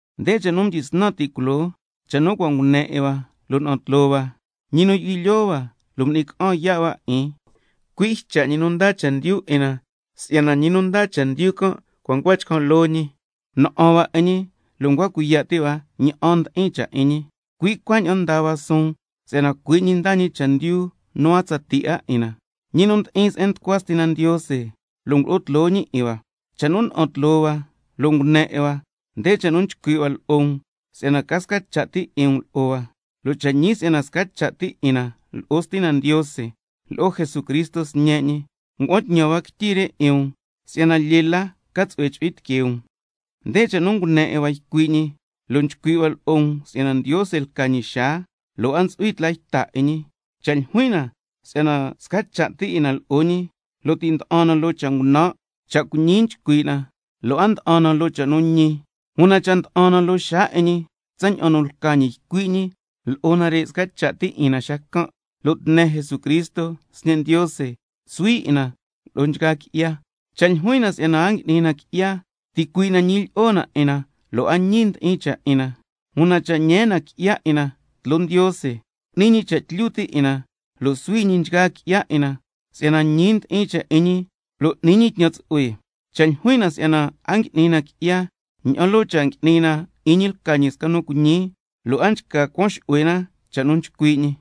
Nde cha' nu mdyisnan ti' culoo, cha' nu cua' ngune 'in hua, lo' na'an tloo hua, ñi nu yu'hui lyoo hua, m'ni ca'an yaa' hua 'in, cui' Ycha' ñi nu ndaa chendyu 'in na. (Si'yana ñi nu ndaa chendyu can' ncua chcan' loo ñi, na'an hua 'in ñi, lo' ncua cuiya' ti' hua ña'an ndi'in cha' 'in ñi, cui' cuaña'an ndaa hua suun si'yana cui' ñi ndaa ñi chendyu nu a tsatii 'a 'in na, ñi nu mdi'in se'en nducua Stina Ndiose, lo' ngulo'o tloo ñi 'in hua). Cha' nu na'an tloo hua lo' ngune 'in hua, nde cha' nu nchcui' hua lo'o um, si'yana ca sca cha' ti 'in um lo'o hua, lo' cha' ñi si'yana sca cha' ti 'in na lo'o Stina Ndiose lo'o Jesucristo Sñe' ñi. Ngua'an tñan hua quityi re 'in um, si'yana lyee la ca tsu'hue chu'hui tiquee um. Nde cha' nu ngune 'in hua ycui' ñi, lo' nchcui' hua lo'o um si'yana Ndiose lca ñi xaa, lo' a ntsu'hui tla yta 'in ñi. Cha' ljuin na si'yana sca cha' ti 'in na lo'o ñi, lo' ti' nda'an na loo cha' ngunan', cha' cuiñi nchcui' na lo' a nda'an na loo cha' nu ñi. Una cha' nda'an na loo xaa 'in ñi tsaña'an nu lca ñi ycui' ñi, lo'o nare' sca cha' ti 'in na xacan', lo' tne Jesucristo Sñe' Ndiose nsuhui 'in na lo'o nchgaa qui'ya. Cha' ljuin na si'yana a ngui'ni na qui'ya, ticuii' na ñilyi'o na 'in na, lo' a ñi ndi'in cha' 'in na. Una cha' ñee na qui'ya 'in na tloo Ndiose, cu'ni ñi cha' tlyu ti' 'in na, lo' suhui ñi nchgaa qui'ya 'in na, si'yana ñi ndi'in cha' 'in ñi lo' n'ni ñi tñan tsu'hue. Cha' ljuin na si'yana a ngui'ni na qui'ya, ña'an loo cha' ngui'ni na 'in ñi lca ñi sca nu cuiñi, lo' a nchca cuan xu'hue na cha' nu nchcui' ñi.